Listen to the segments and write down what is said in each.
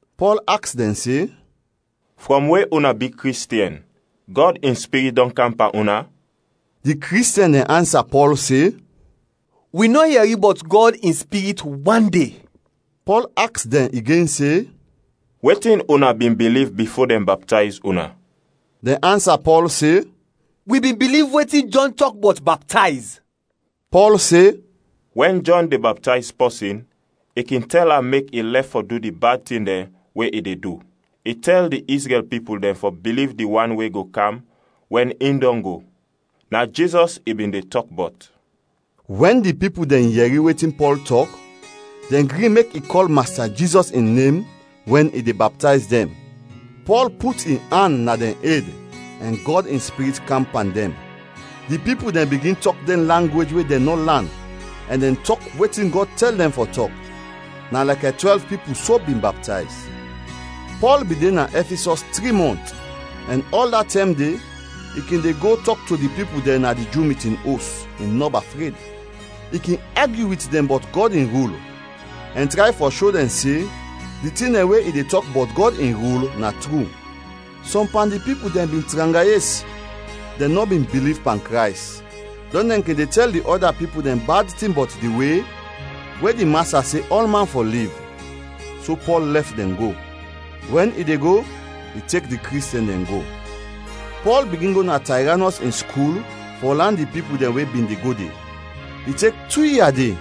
Pɔl aks dɛn se, “Frɔm we una bi Kristiɛn, Gɔd in Spirit dɔn kam pan una?” Di Kristiɛn dɛn ansa Pɔl se, “Wi nɔ yɛri bɔt Gɔd in Spirit wande.” Pɔl aks dɛn igen se, “Wetin una bin biliv bifo dɛn baptayz una?” Dɛn ansa Pɔl se, “Wi bin biliv wetin Jɔn tɔk bɔt baptayz.” Pɔl se, “Wɛn Jɔn de baptayz pɔsin, i kin tɛl am mek i lɛf fɔ du di bad tin dɛn we i de du; i tɛl di Izrɛl pipul dɛn fɔ biliv di Wan we go kam wɛn in dɔn go. Na Jizɔs i bin de tɔk bɔt.” Wɛn di pipul dɛn yɛri wetin Pɔl tɔk, dɛn gri mek i kɔl Masta Jizɔs in nem wɛn i de baptayz dɛn. Pɔl put in an na dɛn ed ɛn Gɔd in Spirit kam pan dɛn. Di pipul dɛn bigin tɔk dɛn langwej we dɛn nɔ lan ɛn dɛn tɔk wetin Gɔd tɛl dɛn fɔ tɔk. Na lɛkɛ twɛlv pipul so bin baptayz. Pɔl bin de na Ɛfisɔs tri mɔnt ɛn ɔl da tɛm de i kin de go tɔk to di pipul dɛn na di Ju mitin os, i nɔba fred. I kin agyu wit dɛn bɔt Gɔd in rul ɛn tray fɔ sho dɛn se di tin dɛn we i de tɔk bɔt Gɔd in rul na tru. Sɔm pan di pipul dɛn bin tranga yes, dɛn nɔ bin biliv pan Krays, dɔn dɛn kin de tɛl di ɔda pipul dɛn bad tin bɔt di We, we di Masta se ɔlman fɔ liv; so Pɔl lɛf dɛn go. Wɛn i de go, i tek di Kristiɛn dɛn go. Pɔl bigin go na Tayranɔs in skul fɔ lan di pipul dɛn we bin de go de. I tek tu ia de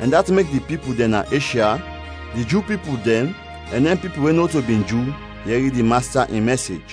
ɛn dat mek di pipul dɛn na Eshya, di Ju pipul dɛn, ɛn dɛn pipul we nɔto bin Ju yɛri di Masta in mɛsej.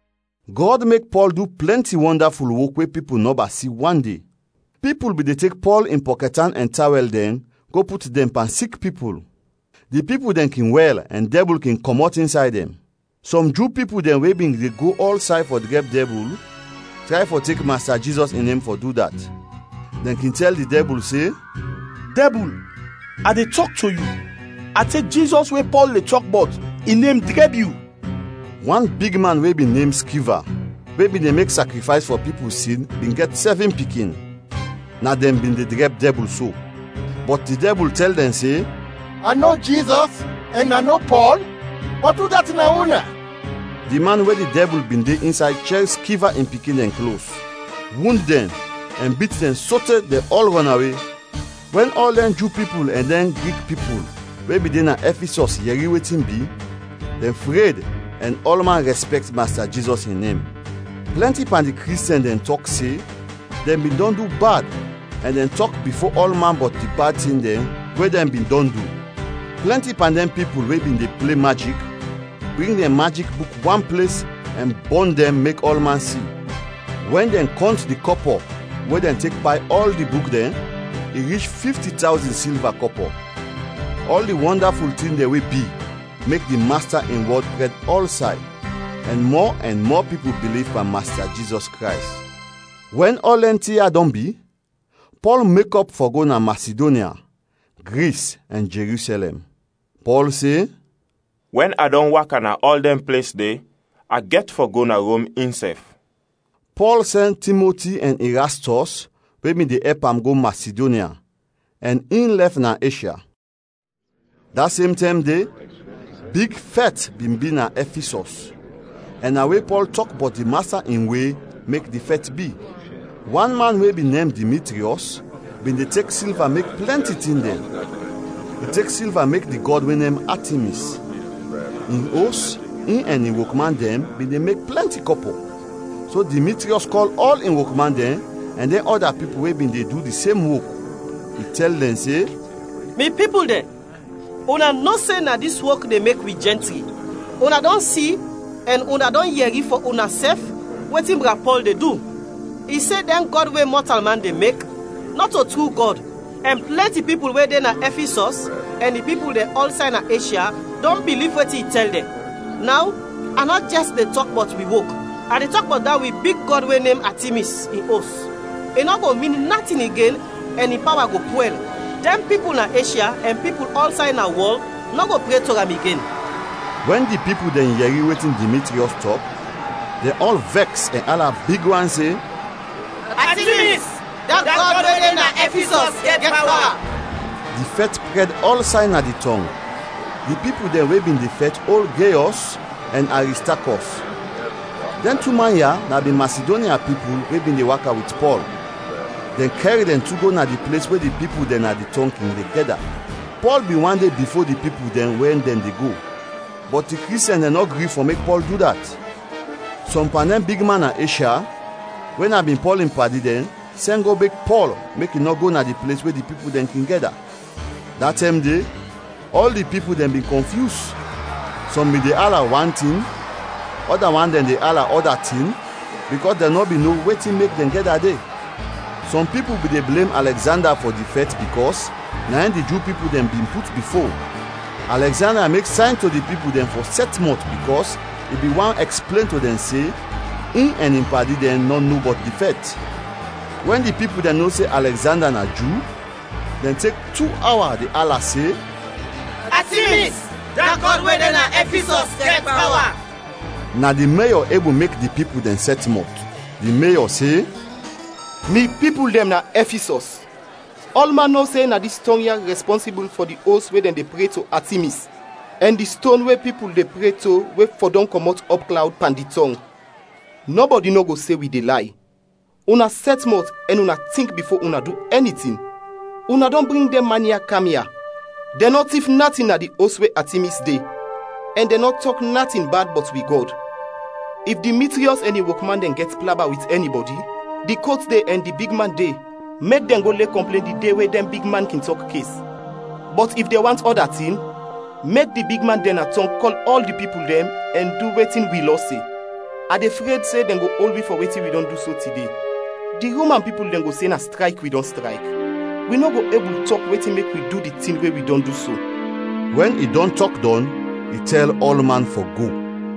Gɔd mek Pɔl du plɛnti wɔndaful wok we pipul nɔba si wande. Pipul bin de tek Pɔl in pɔkɛtan ɛn tawɛl dɛn go put dɛn pan sik pipul. Di pipul dɛn kin wɛl ɛn dɛbul kin kɔmɔt insay dɛn. Sɔm Ju pipul dɛn we bin de go ɔlsay fɔ drɛb dɛbul tray fɔ tek Masta Jizɔs in nem fɔ du dat. Dɛn kin tɛl di dɛbul se, “Dɛbul, a de tɔk to yu, a tek Jizɔs we Pɔl de tɔk bɔt, in nem drɛb yu.” Wan bigman we bin nem Skeva, we bin de mek sakrifays fɔ pipul sin, bin gɛt sɛvin pikin; na dɛn bin de drɛb dɛbul so. Bɔt di dɛbul tɛl dɛn se, “A no Jizɔs ɛn a no Pɔl, bɔt udat na una?” Di man we di dɛbul bin de insay chɛr Skeva in pikin dɛn klos, wund dɛn, ɛn bit dɛn sote dɛn ɔl rɔnawe. Wɛn ɔl dɛn Ju pipul ɛn dɛn Grik pipul we bin de na Ɛfisɔs yɛri wetin bi, dɛn fred ɛn ɔlman rɛspɛkt Masta Jizɔs in nem. Plɛnti pan di Kristiɛn dɛn tɔk se dɛn bin dɔn du bad ɛn dɛn tɔk bifo ɔlman bɔt di bad tin dɛn we dɛn bin dɔn du. Plɛnti pan dɛn pipul we bin de ple majik bring dɛn majik buk wan ples ɛn bɔn dɛn mek ɔlman si. Wɛn dɛn kɔnt di kɔpɔ we dɛn tek bay ɔl di buk dɛn, i rich fifti tawzin silva kɔpɔ. Ɔl di wɔndaful tin dɛn we bi, mek di Masta in wɔd prɛd ɔlsay, ɛn mɔ ɛn mɔ pipul biliv pan Masta Jizɔs Krays. Wɛn ɔl dɛn tin ya dɔn bi, Pɔl mekɔp fɔ go na Masidonya, Gris, ɛn Jerusɛlɛm. Pɔl se, “Wɛn a dɔn waka na ɔl dɛn ples de, a gɛt fɔ go na Rom insɛf.” Pɔl sɛn Timoti ɛn Irastɔs we bin de ɛp am go Masidonya, ɛn in lɛf na Eshya. Da sem tɛm de, big fɛt bin bi na Ɛfisɔs, ɛn na we Pɔl tɔk bɔt di Masta in We mek di fɛt bi. Wan man we bin nem Dimitriɔs bin de tek silva mek plɛnti tin dɛn. I tek silva mek di gɔd we nem Atimis. In os in ɛn in wokman dɛn bin de mek plɛnti kɔpɔ. So Dimitriɔs kɔl ɔl in wokman dɛn ɛn dɛn ɔda pipul we bin de du di sem wok; i tɛl dɛn se, “Mi pipul dɛn, una no se na dis wok de mek wi jɛntri. Una dɔn si ɛn una dɔn yɛri fɔ unasɛf wetin bra Pɔl de du. I se dɛn gɔd we mɔtalman de mek, nɔto tru gɔd ɛn plɛnti pipul we de na Ɛfisɔs ɛn di pipul dɛn ɔlsay na Eshya dɔn biliv wetin i tɛl dɛn. Naw a nɔ jɛs de tɔk bɔt wi wok, a de tɔk bɔt da wi big gɔd we nem Atimis, in os; i nɔ go min natin igen ɛn in pawa go pwɛl. Dɛn pipul na Eshya ɛn pipul ɔlsay na wɔl nɔ go pre to am igen!” Wɛn di pipul dɛn yɛri wetin Dimitriɔs tɔk, dɛn ɔl vɛks ɛn ala big wan se, “Atimis, da gɔd we de na Ɛfisɔs, gɛt pawa!” Di fɛt prɛd ɔlsay na di tɔng. Di pipul dɛn we bin de fɛt ol Geyɔs ɛn Aristakɔs. Dɛn tu man ya na bin Masidonya pipul we bin de waka wit Pɔl. Dɛn kɛr dɛn tu go na di ples we di pipul dɛn na di tɔng kin de gɛda. Pɔl bin want de bifo di pipul dɛn wɛn dɛn de go, bɔt di Kristiɛn dɛn nɔ gri fɔ mek Pɔl du dat. Sɔm pan dɛn bigman na Eshya we na bin Pɔl in padi dɛn, sɛn go beg Pɔl mek i nɔ go na di ples we di pipul dɛn kin gɛda. Da tɛm de, ɔl di pipul dɛn bin kɔnfyus; sɔm bin de ala wan tin, ɔda wan dɛn de ala ɔda tin bikɔs dɛn nɔ bin no wetin mek dɛn gɛda de. Sɔm pipul bin de blem Alɛgzanda fɔ di fɛt bikɔs na in di Ju pipul dɛn bin put bifo. Alɛgzanda mek sayn to di pipul dɛn fɔ sɛt mɔt bikɔs i bin want ɛksplen to dɛn se in ɛn in padi dɛn nɔ no bɔt di fɛt. Wɛn di pipul dɛn no se Alɛgzanda na Ju, dɛn tek tu awa de ala se, “Atimis, da gɔd we de na Ɛfisɔs, gɛt pawa!” Na di Meyɔ ebul mek di pipul dɛn sɛt mɔt. Di Meyɔ se, “Mi pipul dɛn na Ɛfisɔs, ɔlman no se na dis tɔng ya rɛspɔnsibul fɔ di os we dɛn de pre to Atimis ɛn di ston we pipul de pre to we fɔdɔm kɔmɔt ɔpklawd pan di tɔng. Nɔbɔdi nɔ go se wi de lay. Una sɛt mɔt ɛn una tink bifo una du ɛni tin. Una dɔn bring dɛn man ya kam ya. Dɛn nɔ tif natin na di os we Atimis de ɛn dɛn nɔ tɔk natin bad bɔt wi gɔd. If Dimitriɔs ɛn in wokman dɛn gɛt plaba wit ɛnibɔdi, di kot de ɛn di bigman de. Mek dɛn go le kɔmplen di de we dɛn bigman kin tɔk kes. Bɔt if dɛn want ɔda tin, mek di bigman dɛn na tɔng kɔl ɔl di pipul dɛn ɛn du wetin wi lɔ se. A de fred se dɛn go ol wi fɔ wetin wi dɔn du so tide. Di Roman pipul dɛn go se na strayk wi dɔn strayk. Wi nɔ go ebul tɔk wetin mek wi du di tin we wi dɔn du so.” Wɛn i dɔn tɔk dɔn, i tɛl ɔlman fɔ go.